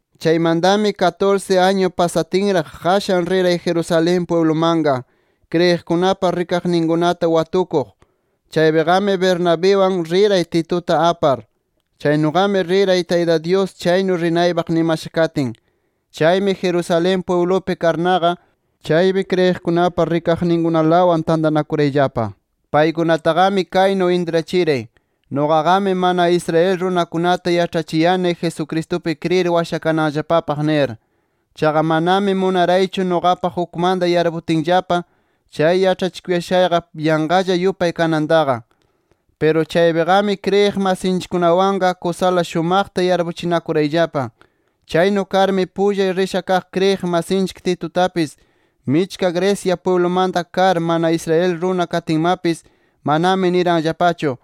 Chaymantami katursi añu pasatinraq qashan riray Jerusalén pwiblumanqa, kriyiqkunapa rikaqninkunata watukuq. Chaypiqami Bernabiwan riray, Tituta apar. Chaynuqami riray, Tayta Dyus chaynu rinaypaq nimasha katin. Chaymi Jerusalén pwiblupi karnaqa chaypi kriyiqkunapa rikaqninkunalawan tantanakurayllapa. Paykunataqami kaynu intrachiray: “Nuqaqami mana Israel runakunata yaĉhachiyani Jesucristupi kriyir washakananllapapaq” nir. Chaqa manami munaraychu nuqapaq ukmanta yarputinllapa chay yaĉhachikuyashayqa yanqalla yupay kanantaqa. Piru chaypiqami kriyiq masiykunawanqa kusala shumaqta yarpuchinakurayllapa. Chaynu karmi pullay risha kaq kriyiq masinchik Titutapis michka Grecia pwiblumanta kar, mana Israel runa katinmapis manami niranllapachu: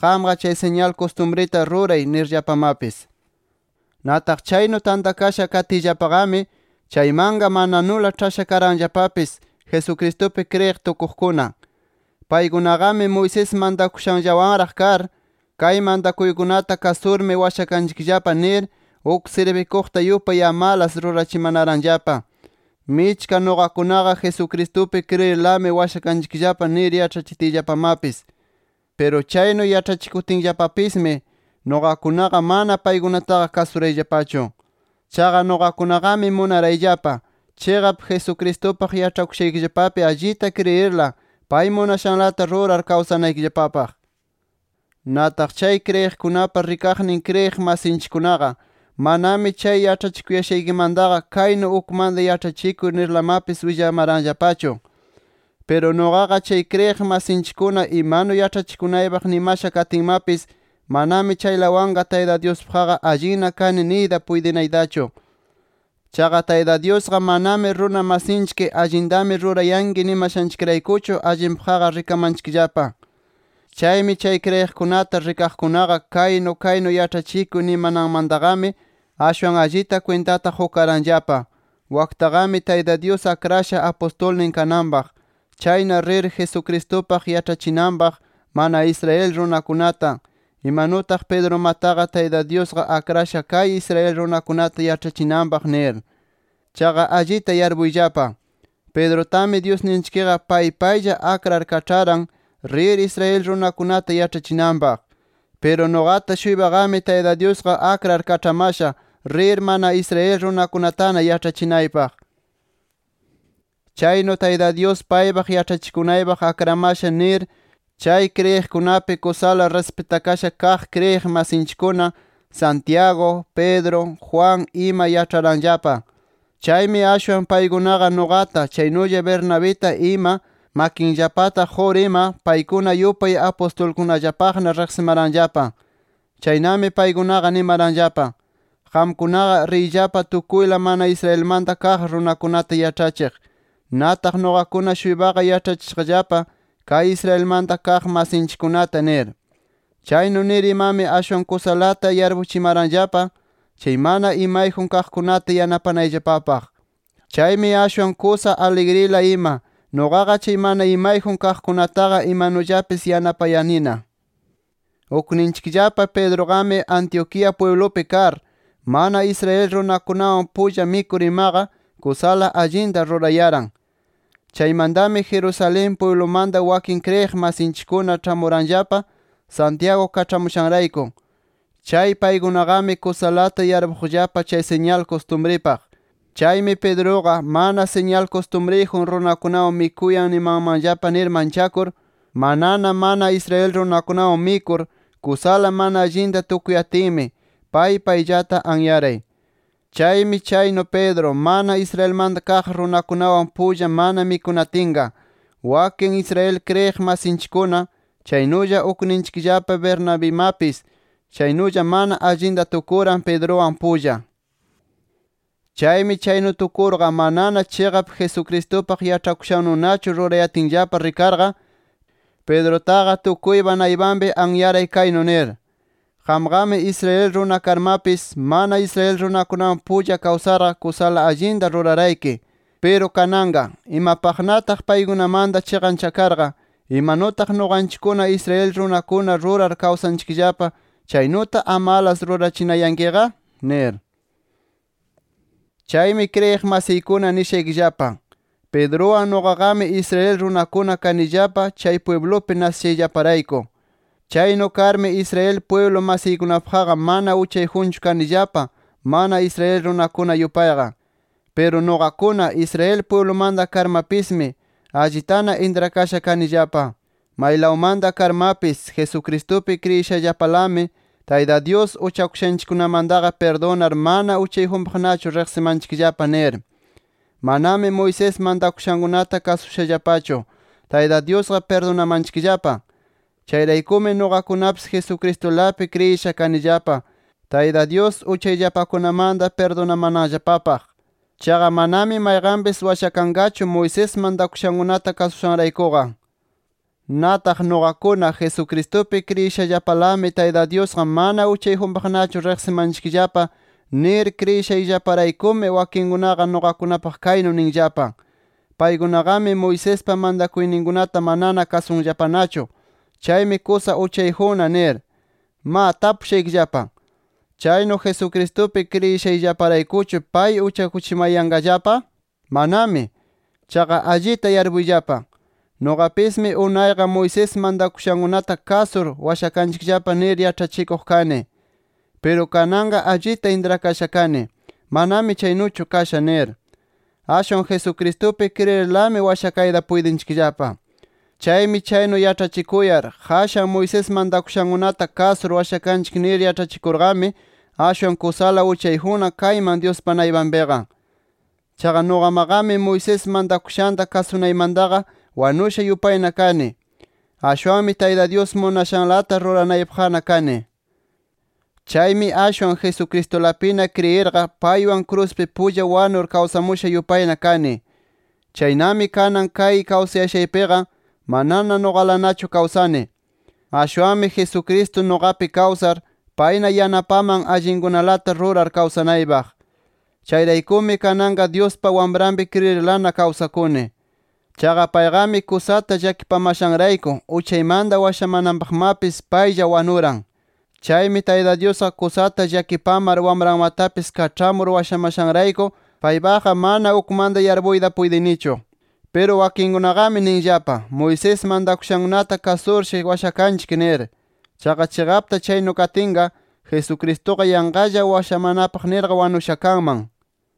“Qamqa chay siñal kustumrita ruray” nirllapamapis. Nataq chaynu tantakasha katiyllapaqami, chaymanqa mananula ĉhasha karanllapapis Jesucristupi kriyiq tukuqkuna. Paykunaqami Moisés mantakushankunallawanraq kar, kay mantakuykunata kasurmi washakanchikllapa nir uk sirbikuqta yupay amalas rurachimanaranllapa, michka nuqakunaqa Jesucristupi kriyirlami washakanchikllapa nir yaĉhatiyllapamapis. Piru chaynu yaĉhachikutinllapapismi, nuqakunaqa mana paykunataqa kasurayllapachu. Chaqa nuqakunaqami munarayllapa, chiqap Jesucristupaq yaĉhakushaykillapapi allita kriyirla pay munashanlata rurar kawsanaykillapapaq. Nataq chay kriyiqkunapa rikaqnin kriyiq masinchikkunaqa, manami chay yaĉhachikuyashaykimantaqa kaynu ukmanta yaĉhachikuy nirlamapis willamaranllapachu. Piru nuqaqa chay kriyiq masinchikkuna imanu yaĉhachikunaypaq nimasha katinmapis, manami chaylawanqa Tayta Dyuspaqqa allinna kani niytaqa puytinaytachu. Chaqa Tayta Dyusqa manami runa masinchik allintami rurayanki nimashanchikraykuchu, allinpaqqa rikamanchikllapa. Chaymi chay kriyiqkunata rikaqkunaqa kaynu kaynu yaĉhachikuy nimananmantaqami, ashwan allita kwintata qukaranllapa: Waktaqami Tayta Dyus akrasha apustulnin kananpaq. Chayna rir, Jesucristupaq yaĉhachinanpaq mana Israel runakunata, imanutaq Pedrumataqa Tayta Dyusqa akrasha kay Israel runakunata yaĉhachinanpaq nir. Chaqa allita yarpuyllapa: Pedrutami Dyusninchikqa pay paylla akrar kaĉharan rir Israel runakunata yaĉhachinanpaq. Piru nuqata-shuypaqami Tayta Dyusqa akrar kaĉhamasha rir mana Israel runakunatana yaĉhachinaypaq. Chaynu Tayta Dyus paypaq yaĉhachikunaypaq akramasha nir chay kriyiqkunapi kusala rispitakasha kaq kriyiq masinchikkuna Santiago, Pedro, Juan ima yaĉharanllapa. Chaymi ashwan paykunaqa nuqata chaynulla Bernabita ima makinllapata qur ima paykuna yupay apustulkunallapaqna riqsimaranllapa. Chaynami paykunaqa nimaranllapa: “Qamkunaqa riyllapa tukuyla mana Israelmanta kaq runakunata yaĉhachiq. Nataq nuqakuna-shuypaqa yaĉhachishaqllapa kay Israelmanta kaq masinchikkunata” nir. Chaynu nir imami ashwan kusalata yarpuchimaranllapa chay mana imayjun kaqkunata yanapanayllapapaq. Chaymi ashwan kusa aligrila ima, nuqaqa chay mana imayjun kaqkunataqa imanullapis yanapayanina. Ukninchikllapa Pedruqami Antioquía pwiblupi kar, mana Israel runakunawan pulla mikur imaqa kusala allinta rurayaran. Chaymantami Jerusalén pwiblumanta wakin kriyiq masinchikkuna ĉhamuranllapa Santiago kaĉhamushanrayku. Chay paykunaqami kusalata yarpuqllapa chay siñal kustumripaq. Chaymi Pedruqa, mana siñal kustumriyjun runakunawan mikuyan nimanmanllapa nir manchakur, manana mana Israel runakunawan mikur kusala mana allinta tukuyatinmi, pay payllata anyaray. Chaymi chaynu Pedro, mana Israelmanta kaq runakunawan pulla mana mikunatinqa, wakin Israel kriyiq masinchikkuna, chaynulla ukninchikllapa Bernabimapis chaynulla mana allinta tukuran Pedruwan pulla. Chaymi chaynu tukurqa manana chiqap Jesucristupaq yaĉhakushannunachu rurayatinllapa rikarqa, Pedrutaqa tukuypa naypanpi anyaray kaynu nir: “Qamqami Israel runa karmapis, mana Israel runakunawan pulla kawsarqa kusala allinta rurarayki. Piru kananqa, ¿imapaqnataq paykunamanta chiqanchakarqa, imanutaq nuqanchikkuna Israel runakuna rurar kawsanchikllapa chaynuta amalas rurachinayankiqa?” nir. Chaymi kriyiq masiykuna nishaykillapa: Pedruwan nuqaqami Israel runakuna kanillapa chay pwiblupi nasishayllaparayku. Chaynu karmi Israel pwiblu masiykunapaqqa mana uchayjunchu kanillapa, mana Israel runakuna yupayqa. Piru nuqakuna, Israel pwiblumanta karmapismi, allitana intrakasha kanillapa: Maylawmanta karmapis, Jesucristupi kriyishallapalami, Tayta Dyus uchakushanchikkunamantaqa pirdunar mana uchayjunpaqnachu riqsimanchikllapa nir. Manami Moisés mantakushankunata kasushallapachu, Tayta Dyusqa pirdunamanchikllapa. Chayraykumi nuqakunapis Jesucristulapi kriyisha kanillapa, Tayta Dyus uchayllapakunamanta pirdunamananllapapaq. Chaqa manami mayqanpis washakanqachu Moisés mantakushankunata kasushanraykuqa. Nataq nuqakuna, Jesucristupi kriyishallapalami Tayta Dyusqa mana uchayjunpaqnachu riqsimanchikllapa nir kriyishayllaparaykumi, wakinkunaqa nuqakunapaq kaynu ninllapa: “Paykunaqami Moisespa mantakuyninkunata manana kasunllapanachu. Chaymi kusa uchayjunna” nir. Ma, tapushaykillapa: ¿Chaynu Jesucristupi kriyishayllaparaykuchu, pay uchakuchimayanqallapa? ¡Manami! Chaqa allita yarpuyllapa: Nuqapismi unayqa, Moisés mantakushankunata kasur washakanchikllapa nir yaĉhachikuq kani. Piru kananqa allita intrakasha kani, manami chaynuchu kasha nir. Ashwan Jesucristupi kriyirlami washakayta puytinchikllapa. Chaymi chaynu yaĉhachikuyar, qashan Moisés mantakushankunata kasur washakanchik nir yaĉhachikurqami, ashwan kusala uchayjunna kayman Dyuspa naypanpiqa. Chaqa nuqamaqami Moisés mantakushanta kasunaymantaqa wanusha yupayna kani. Ashwanmi Tayta Dyus munashanlata ruranaypaqna kani. Chaymi ashwan Jesucristulapina kriyirqa paywan kruspi pulla wanur kawsamusha yupayna kani. Chaynami kanan kay kawsayashaypiqa manana nuqalanachu kawsani. Ashwanmi Jesucristo nuqapi kawsar, payna yanapaman, allinkunalata rurar kawsanaypaq. Chayraykumi kananqa Dyuspa Wamranpi kriyirlana kawsakuni. Chaqa payqami kusata llakipamashanrayku uchaymanta washamananpaqmapis paylla wanuran. Chaymi Tayta Dyusqa kusata llakipamar Wamranmatapis kaĉhamur washamashanrayku paypaqqa mana ukmanta yarpuyta puytinichu. Piru wakinkunaqami ninllapa, Moisés mantakushankunata kasurshi washakanchik nir. Chaqa chiqapta chaynu katinqa, Jesucristuqa yanqalla washamanapaq nirqa wanusha kanman.